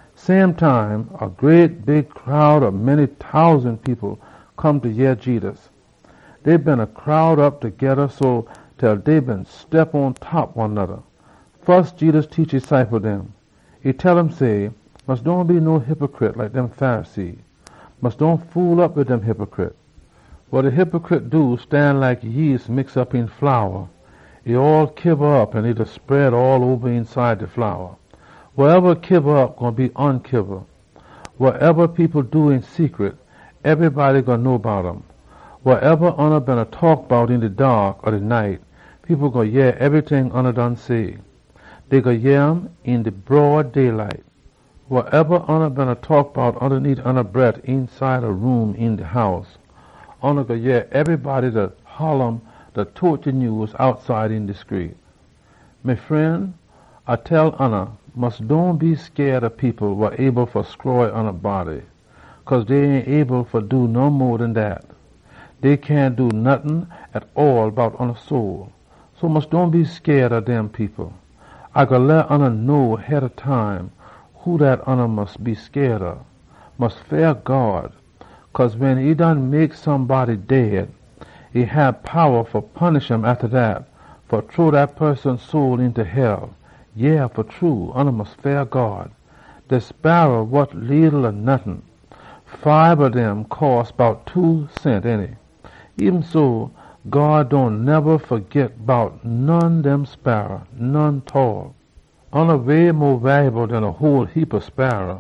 Same time, a whole heapa people come fa yeh Jedus. Dey beena crowd op togeda so, til dey beena step pontop one noda. Fus Jedus laan e ciple dem. E tell um say, “Mus dohn be no hypicrit like dem Pharisee. Mus dohn fool op wid dem hypicrit, wa stan like yeast mix op een flour. E all kiba op an e da spread all oba eenside de flour. Wasoneba kiba op gwine be onkiba. Wasoneba people do een secret, ebrybody gwine know bout um. Wasoneba oona beena taak bout een de daak ob de night, people gwine yeh ebryting oona done say. Dey gwine yeh um een de broad day light. Wasoneba oona beena taak bout ondaneet oona bret eenside a room een de house, oona gwine yeh ebrybody da holla um, da tote de nyews outside een de screet. “Me fren, A tell oona, mus dohn be scaid ob people wa able fa stroy oona body, cause dey ain able fa do no mo den dat. Dey cyahn do nottin tall bout oona soul. So mus dohn be scaid ob dem people. A gwine leh oona know head ob time who dat oona mus be scaid ob. Mus feah God. Cause wen e done mek somebody dead, e hab powa fa punish um atta dat, fa chunk dat poson soul eenta hell. Yeah, fa true, oona mus feah God! “De sparra wot leetle or nottin. Fibe ob dem cost bout two cent, ainty? Eben so, God dohn neba fagit bout none ob dem sparra, none tall. Oona way mo walyable den a whole heapa sparra.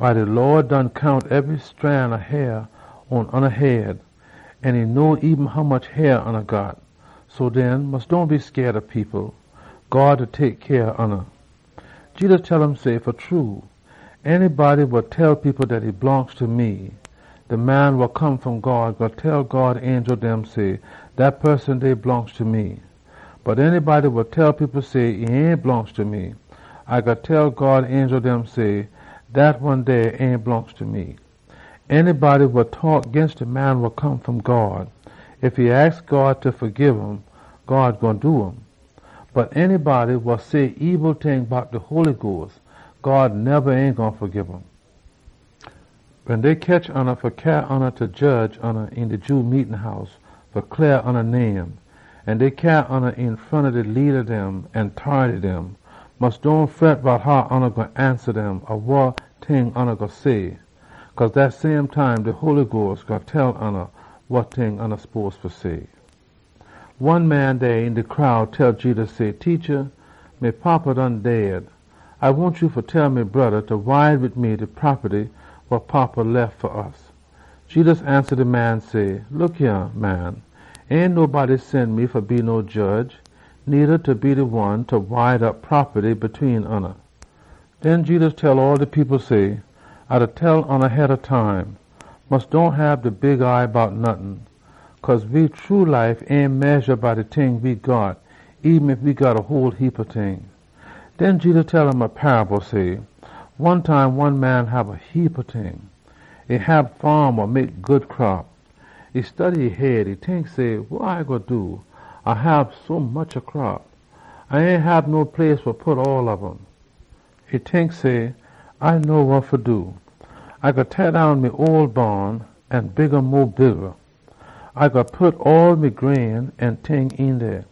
De Lawd God done count ebry scran ob hair pon oona head, an e know eben hommuch hair oona got. So den, mus dohn be scaid ob people. God da tek cyah ob oona!” Jedus tell um say, “Fa true, anybody wa tell people dat e blongst ta me, de Man wa Come fom God gwine tell God angel dem say, ‘Dat poson dey blongst ta me.’ Bot anybody wa tell people say, e ain blongst ta me, A gwine tell God angel dem say, ‘Dat one dey ain blongst ta me!’ “De poson wa taak ginst de Man wa Come fom God, God kin fagib um, bot de poson wa say ebil ting ginst de Holy Sperit, God ain neba gwine fagib um. “Wen dey ketch oona fa jedge oona een de Jew meetin house, an dey cyaa oona een front ob de leada dem an tority dem, mus dohn fret bout how oona gwine ansa dem, or wa ting oona gwine say. Cause dat same time, de Holy Sperit gwine tell oona wa ting oona spose fa say.” One man dey een de crowd tell Jedus say, “Teacha, me fada done dead. A wahn ya fa tell me broda fa wide wid me de propaty we fada lef fa we.” Jedus ansa de man say, “Look yah, man, ain nobody sen me fa be no jedge, needa fa be de one fa wide op propaty tween oona.” Den Jedus tell all de people say, “A da tell oona head ob time, mus dohn hab de big eye bout nottin. Cause we true life ain medja by de ting dem we got, eben ef we got a whole heapa ting.” Den Jedus tell um a paable, say, “One time, one man hab a heapa ting. E hab faam wa mek good crop. E study e head, e tink say, ‘Wa A gwine do? A hab sommuch crop, A ain hab no place fa pit all ob um.’ E tink say, ‘A know wa fa do. A gwine teah down me ole baan an build um mo bigga. A gwine pit all me grain an ting een dey.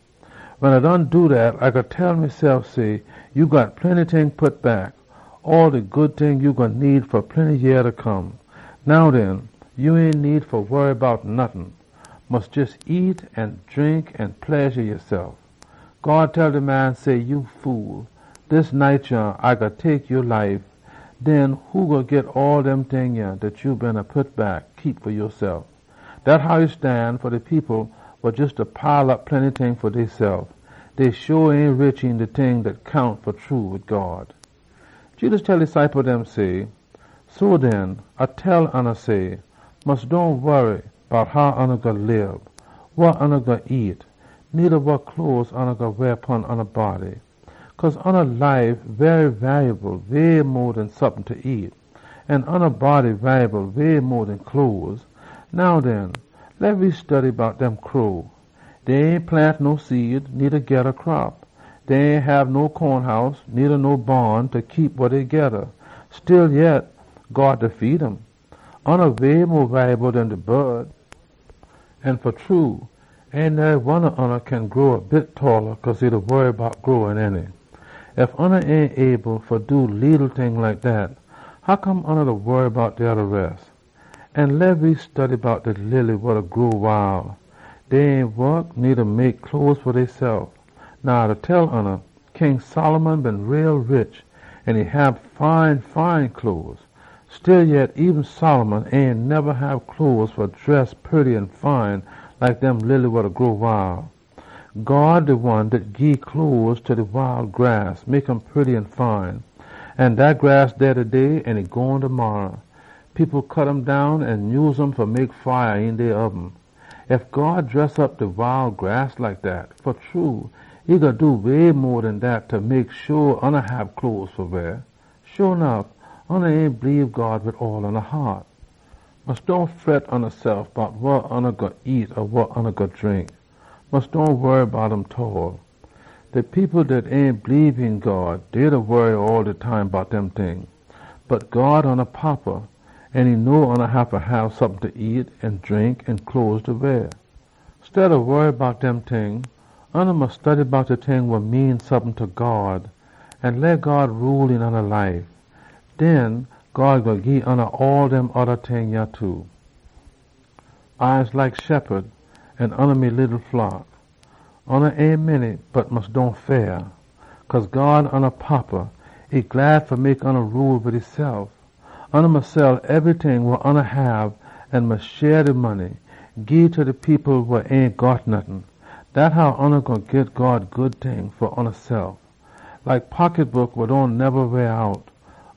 Wen A done do dat, A gwine tell mesef say, ya got plenty ting pit back, all de good ting dem ya gwine need fa plenty yeah fa come. Now den, ya ain need fa warry bout nottin. Mus jes nyam an drink an pledja yasef!’ God tell de man say, ‘Ya fool! Dis night yah, A gwine tek ya life. Den who gwine git all dem ting yah dat ya beena pit back, fa keep fa yasef?’ “Dat how e stan fa de people wa jes da pile op plenty ting fa deysef. Dey sho ain rich een de ting dem dat count fa true wid God.” Jedus tell e ciple dem say, “So den, A da tell oona say, mus dohn warry bout how ya gwine lib, wa ya gwine nyam, needa wa cloes ya gwine weah pon ya body. Cause ya life walyable way mo den sompin fa nyam, an ya body walyable way mo den cloes. Now den, leh we study bout dem crow. Dey ain plant no seed, needa geda crop. Dey ain hab no conehouse, needa no baan fa keep wa dey geda. Stillyet, God da feed um! Oona way mo walyable den de bod! An fa true, ain nary one ob oona kin grow a bit talla cause e da warry bout um, ainty? Ef ya ain able fa do leetle ting like dat, hoccome ya da warry bout de oda res? An leh we study bout de lily wa da grow wile. Dey ain wok, needa mek cloes fa deysef. Now, A da tell oona, King Solomon been too rich, an e hab fine cloes. Stillyet, eben Solomon ain neba hab cloes fa dress purty an fine like dem lily wa da grow wile. God de one dat gii cloes ta de wile grass, mek um purty an fine. An dat grass dey taday, an e gone demarra. People cut um down an nyuse um fa mek fire een dey oben. Ef God dress op de wile grass like dat, fa true e gwine do way mo den dat fa mek sho oona hab cloes fa weah. Sho nuff oona ain bleebe God wid all oona haat! Mus dohn fret yasef bout wa ya gwine nyam an wa ya gwine drink. Mus dohn warry bout um tall. De people dat ain bleebe pon God, dey da warry all de time bout dem ting. Bot God oona Fada, an e know oona haffa hab sompin fa nyam an drink an cloes fa weah. Steada dat, ya mus study bout how fa leh God rule een ya life. Den God gwine gii ya all dem oda ting too.” “A de shephud, an oona me leetle flock. Oona ain a whole heap, bot mus dohn fret. Cause God oona Fada, e glad fa mek oona rule wid esef. Oona mus sell ebryting wa oona hab an gii ta de people wa ain got nottin. Dat how ya gwine git God good ting fa oonasef. Like money wa dohn neba ron out,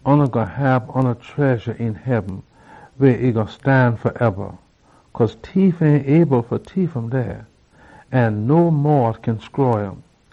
ya gwine hab ya tredja een heaben, weh e gwine stan faeba. Cause tief ain able fa tief um dey, an no mot kin stroy um.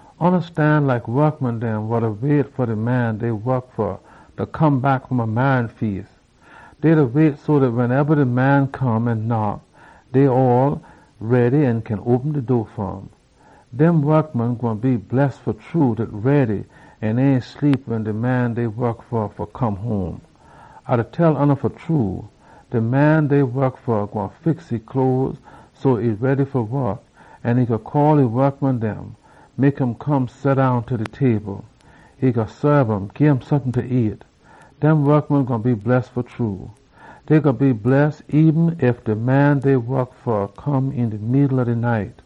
Oona mus stan like a wokman wa da wait fa de man e da wok fa fa come back fom a marry feas. E da wait so dat wensoneba e massa come home an knock, e ready an kin open de door fa um. Dem wokman gwine be bless fa true dat ready an ain sleep wen de man dey wok fa come home! A da tell oona fa true, de man dey wok fa gwine fix e cloes so e ready fa wok, an e gwine call e wokman dem, mek um come seddown ta de table. E gwine saab um, gim sompin fa nyam. Dem wokman gwine be bless fa true. Dey gwine be bless eben ef de man dey wok fa come een de middle ob de night,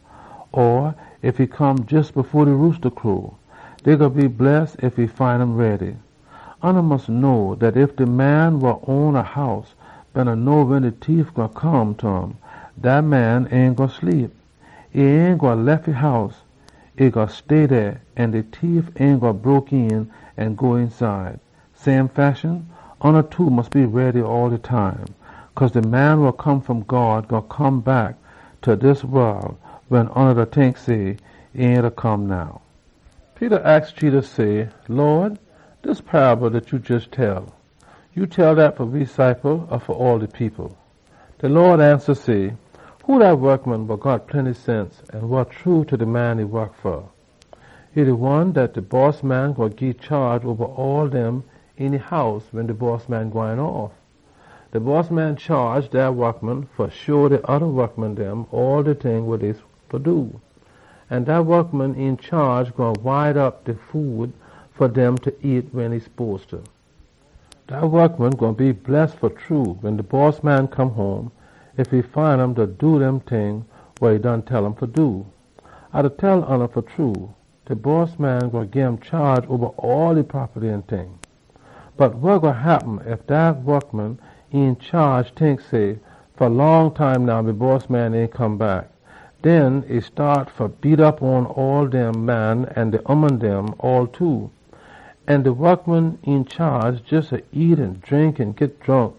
or ef e come jes fo de roosta crow. Dey gwine be bless ef e find um ready! Oona mus know dat ef de man wa own a house been know wen de tief gwine come ta um, dat man ain gwine sleep. E ain gwine lef e house. E gwine stay dey, an de tief ain gwine broke een an go eenside. Same fashion, oona too mus be ready all de time. Cause de Man wa Come fom God gwine come back ta dis wol wen oona da tink say, ‘E ain da come now.’” Peter aks Jedus say, “Lawd, dis paable dat ya jes tell, ya tell dat fa we or fa all de people?” De Lawd ansa say, “Who dat wokman wa got plenty sense an wa true ta de man e da wok fa? E de one dat de bossman gwine gii chaage oba all dem een e house wen de bossman gwine off. De bossman chaage dat wokman fa sho de oda wokman dem all de ting dem dey fa do. An dat wokman een chaage gwine wide op de food fa dem fa nyam wen e spose. Dat wokman gwine be bless fa true, wen de bossman come home, ef e find um da do dem ting wa e done tell um fa do. A da tell oona fa true, de bossman gwine gim chaage oba all e propaty an ting. Bot wa gwine happen ef dat wokman een chaage tink say, ‘Fa long time now, me bossman ain come back.’ Den e staat fa beat op pon all dem man an ooman. An de wokman een chaage jes da nyam an drink an git dronk.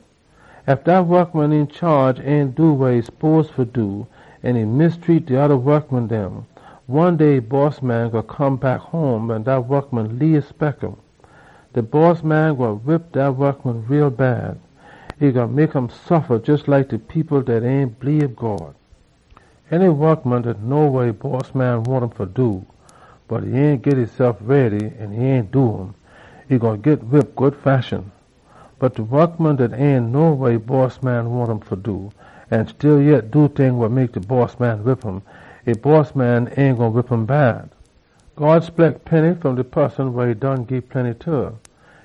Ef dat wokman een chaage ain do wa e spose fa do an e treat de oda wokman dem bad, one day e bossman gwine come back home wen dat wokman ain spect um. De bossman gwine whip dat wokman too bad. E gwine mek um suffa jes like de people dat ain bleebe God. “De wokman dat know wa e bossman wahn um fa do, bot e ain git esef ready an e ain do um, e gwine git whip good fashion. Bot de wokman dat ain know wa e bossman wahn um fa do an stillyet e do ting wa mek de bossman whip um, e bossman ain gwine whip um bad. God spect plenty fom de poson wa e done gii plenty ta.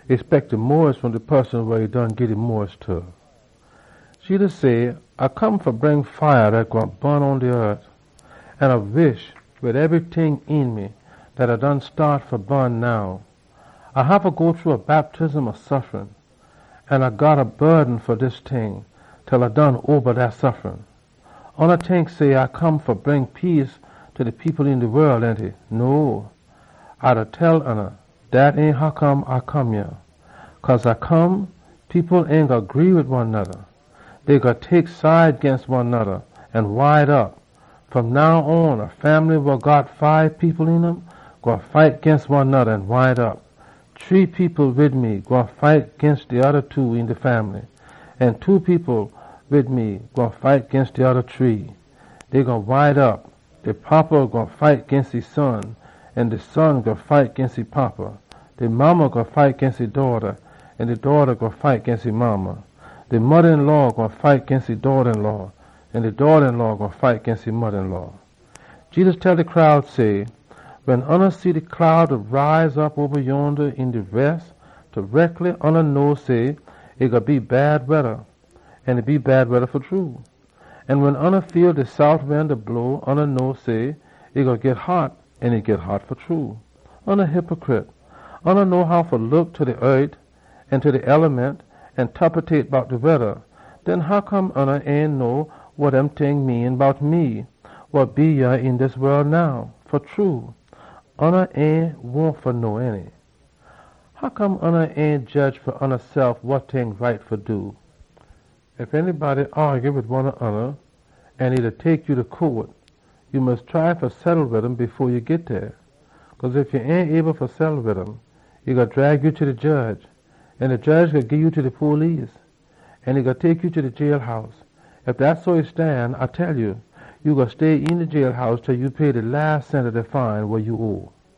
E spect mo fom de poson wa e been gii mo ta.” Jedus say, “A come fa bring fire dat gwine bun pon de eart, an A wish wid ebryting een me dat e done staat fa bun now. A haffa go shru a whole heapa suffrin. A got a burden fa dis ting til A done oba dat. Oona tink say, A come fa bring peace ta de people een de wol, ainty? No, A da tell oona, dat ain hoccome A come yah. Cause A come, people ain gwine gree wid one noda. Dey gwine tek side ginst one noda an wide op. Fom now on, a fambly wa got fibe people een um gwine fight ginst one noda an wide op. Shree people wid me gwine fight ginst de oda two een de fambly. An two people wid me gwine fight ginst de oda shree. Dey gwine wide op. De fada gwine fight ginst e son, an de son gwine fight ginst e fada. De modda gwine fight ginst e daughta, an de daughta gwine fight ginst e modda. De moda-een-law gwine fight ginst e daughta-een-law, an de daughta-een-law gwine fight ginst e moda-een-law.” Jedus tell de crowd say, “Wen oona see de cloud dem da rise op oba yonda een de west, tareckly oona know say, ‘E gwine be bad weda,’ an e bad weda fa true. An wen oona feel de sout wind da blow, oona know say, ‘E gwine git hot,’ an e git hot fa true. Oona hypicrit! Oona know how fa look ta de eart an ta de eliment an tapetate bout de weda. Den hoccome oona ain know wa dem ting mean bout me wa dey yah een dis wol now? Fa true, oona ain wahn fa know, ainty?” “Hoccome oona ain jedge fa oonasef wa right fa do? Ef anybody aagy wid one ob oona an e da tek ya ta court, ya mus try fa settle wid um fo ya git dey. Cause ef ya ain able fa settle wid um, e gwine drag ya ta de jedge. An de jedge gwine gii ya ta de police, an e gwine tek ya ta de jailhouse. Ef dat so e stan, A da tell ya, ya gwine stay een de jailhouse til ya done pay de las cent ob de fine wa ya owe.”